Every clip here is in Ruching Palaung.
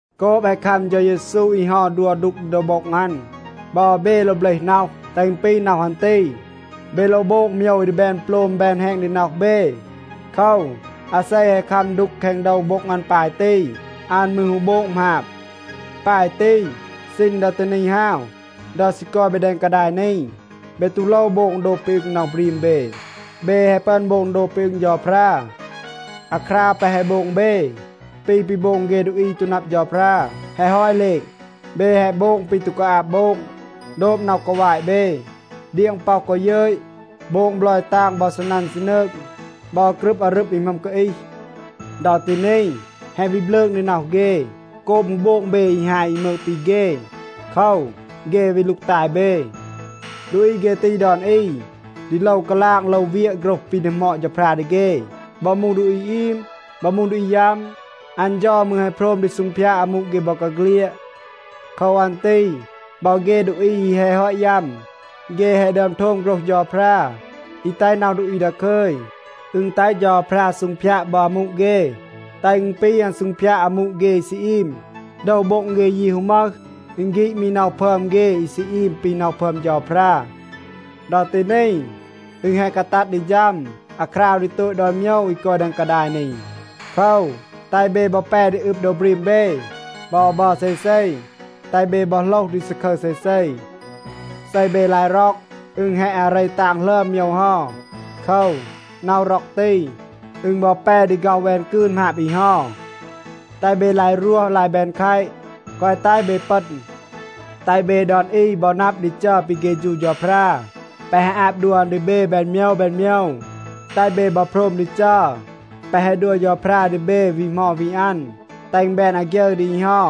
โกบ แฮะ คัม เฌา เยซู อี เฮา ดัว ดูก ดี โดว โบ็ง อัน, บอ เบ โลว เบลห น็อห, แตห อึณ ปี น็อห อัน ตี. เบ โลว โบง โมยว อี ดี แบน โปลม แบน แฮณ ดี น็อห เบ. โคว, อาเซ แฮะ คัม ดูก แคง โดว โบ็ง อัน ปาย ตี, อัน มืร ฮู โบง หมาบ. ปาย ตี, ซีณ ดอ ตี นี ฮาว, ดอ ซี กอย เบ แดง กาดาย นี, เบ ตู โลว โบง โดบ ปี อึง น็อห บรีม เบ. เบ แฮะ ปึอน โบง โดบ ปี อึง เฌาพรา. อาคราว แปะ แฮะ โบง เบ ปี ปี โบง เฆ ดูอี อี ตู นับ เฌาพรา แฮะ ฮอต เหลณ. เบ แฮะ โบง ปี ตู กาอาบ โบง, โดบ น็อห กาวาต เบ, เดียง ป็อห กอ ยึต, โบง บลอย ตาง บอ ซีนัน ซีนืง, บอ กรึบ อารึบ อี หมึอม กาอีห. ดอ ตี นี, แฮะ วี บลืง ดี น็อห เฆ โกบ ฮู โบง เบ อี ฮาย อี มืก ปี เฆ. โคว, เฆ วี ลูกตาย เบ. ดูอี เฆ ตี ดอน อี ดี โลว กาลาง โลว เวียะ โฆรห ปี ดีหมอด เฌาพรา ดี เฆ. บอ มูห ดูอี อีม บอ มูห ดูอี ยัม, อัน เฌา มืร แฮะ โพรม ดี ซูงพยาด อามู เฆ บอกาเฆลียด. โคว อัน ตี บอ เฆ ดูอี อี แฮะ ฮอต ยัม, เฆ แฮะ ดึอม โทม โฆรห เฌาพรา อี แตห น็อห ดูอี ดาคึย. อึณ แตห เฌาพรา ซูงพยาด บอ อามู เฆ, แตห อึณ ปี อัน ซูงพยาด อามู เฆ อี ซี อีม. โดว โบ็ง เฆ ยี ฮู มึห. อึณ ฆีด มี น็อห พึอม เฆ อี ซี อีม ปี น็อห พึอม เฌาพรา. ดอ ตี นี, อึณ แฮะ กาตัด ดี ฌัม อาคราว ดี โตต ดอน โมยว อี กอย แดง กาดาย นี. โคว, แตห เบ บอ แป ดี อึบ โดว บรีม เบ บอ บัร เซเซ, แตห เบ บอ โหลห ดี ซาคึร เซเซ. เซ เบ ลาย ร็อก, อึณ แฮะ อาเร ตาง หลึอม โมยว เฮา. โคว, น็อห ร็อก ตี, อึณ บอ แป ดี ฆ็อห แวน กืน หมาบ อี เฮา. แตห เบ ลาย รวห ลาย แบน แคต. แกวะ แตห เบ ปึณ. แตห เบ ดอน อี บอ นับ ดี จัร ปี เฆฌู เฌาพรา, แปะ แฮะ อาบ ดัว อัน ดี เบ แบน โมยว แบน โมยว. แตห เบ บอ โพรม ดี จัร แปะ แฮะ ดัว เฌาพรา ดี เบ วี เหมา วี อัน. แตห อึณ แบน อาฆยึร ดี อี เฮา.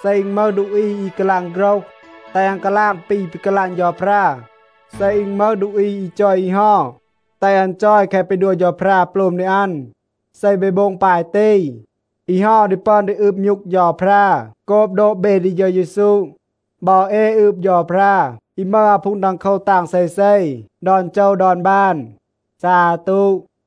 เซ อึณ มึห ดูอี อี กาลาง โฆรห, แตห อัน กาลาง ปี ปี กาลาง เฌาพรา. เซ อึณ มึห ดูอี อี จอย อี เฮา, แตห อัน จอย แคะ ปี ดัว เฌาพรา โปลม ดี อัน. เซ เบ โบง ปาย ตี, อี เฮา ดี ปึอน ดี อืบ มยูก เฌาพรา โกบ โดบ เบ ดี เฌา เยซู. บอ เอ อืบ เฌาพรา อี มึห อาพูง ดังโคว ตาง เซเซ ดอน โจว ดอน บาน. ซาตู.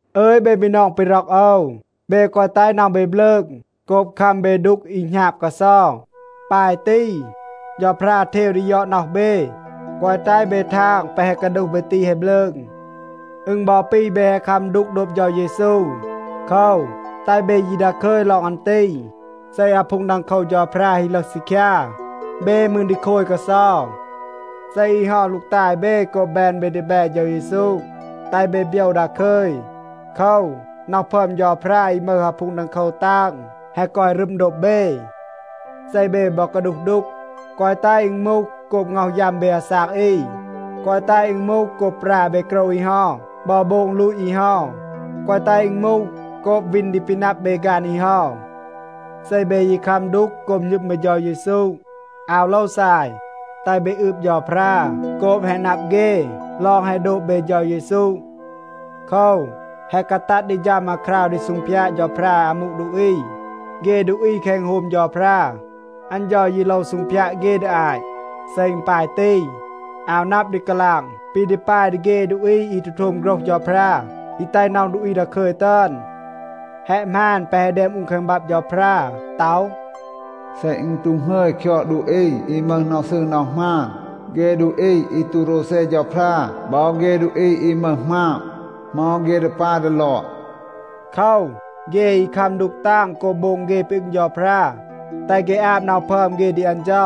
อึย เบ บีนอง ปี ร็อก โอว, เบ แกวะ แตห น็อห เบ บลืง โกบ คัม เบ ดูก อี หณาบ กาเซา. ปาย ตี เฌาพรา เทว ดี ยอด น็อห เบ. แกวะ แตห เบ ทาง แปะ แฮะ กาดูห เบ ตี แฮะ บลืง. อึณ บอ ปี เบ แฮะ คัม ดูก โดบ เฌา เยซู. โคว, แตห เบ ยี ดาคึย ลอง อัน ตี. เซ อาพูง ดังโคว เฌาพรา ฮี ลึห ซีคยา, เบ มืร ดี โคย กาเซา. เซ อี เฮา ลูกตาย เบ โกบ แบน เบ ดีแบ เฌา เยซู, แตห เบ โบยว ดาคึย. โคว, น็อห พึอม เฌาพรา อี มึห อาพูง ดังโคว ตาง แฮะ กอย รึม โดบ เบ. เซ เบ บอ กาดูห ดูก, แกวะ แตห อึณ มูห โกบ ง็อห ยัม เบ อาซาก อี, แกวะ แตห อึณ มูห โกบ ปรา เบ โกรว อี เฮา บอ โบง ลูต อี เฮา. แกวะ แตห อึณ มูห โกบ วีน ดี ปี นับ เบ ฆาน อี เฮา. เซ เบ ยี คัม ดูก โกบ หณึม เบ เฌา เยซู, อาว โลว ซาย. แตห เบ อืบ เฌาพรา โกบ แฮะ นับ เฆ ลอง แฮะ โดบ เบ เฌา เยซู. โคว, แฮะ กาตัด ดี ฌัม อาคราว ดี ซูงพยาด เฌาพรา อามู ดูอี. เฆ ดูอี แคง อึณโฮม เฌาพรา, อัน เฌา ยี โลว ซูงพยาด เฆ ดี อาต. เซ อึณ ปาย ตี, อาว นับ ดี กาลาง ปี ดี ปาย ดี เฆ ดูอี อี ตู โทม โฆรห เฌาพรา อี แตห น็อห ดูอี ดาคึย ตึอน. แฮะ หมาน แปะ แฮะ แดม อูน แคง บับ เฌาพรา ต็อห, “เซ อึณ ตู หงึย คยอด ดูอี อี มึห น็อห ซืร น็อห หมาน, เฆ ดูอี อี ตู โรวเซ เฌาพรา บอ เฆ ดูอี อี มึห หมาบ, เหมา เฆ ดี ปาย ดี ลอด?” โคว, เฆ อี คัม ดูก ตาง โกบ โบง เฆ ปี อึง เฌาพรา, แตห เฆ อาบ น็อห พึอม เฆ ดี อัน เฌา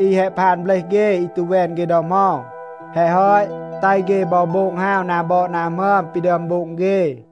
อี แฮะ พาน เบลห เฆ อี ตู แวน เฆ ดอ เหมา. แฮะ ฮอต, แตห เฆ บอ โบง ฮาว นา บอด นา หมึอม ปี ดึอม โบง เฆ.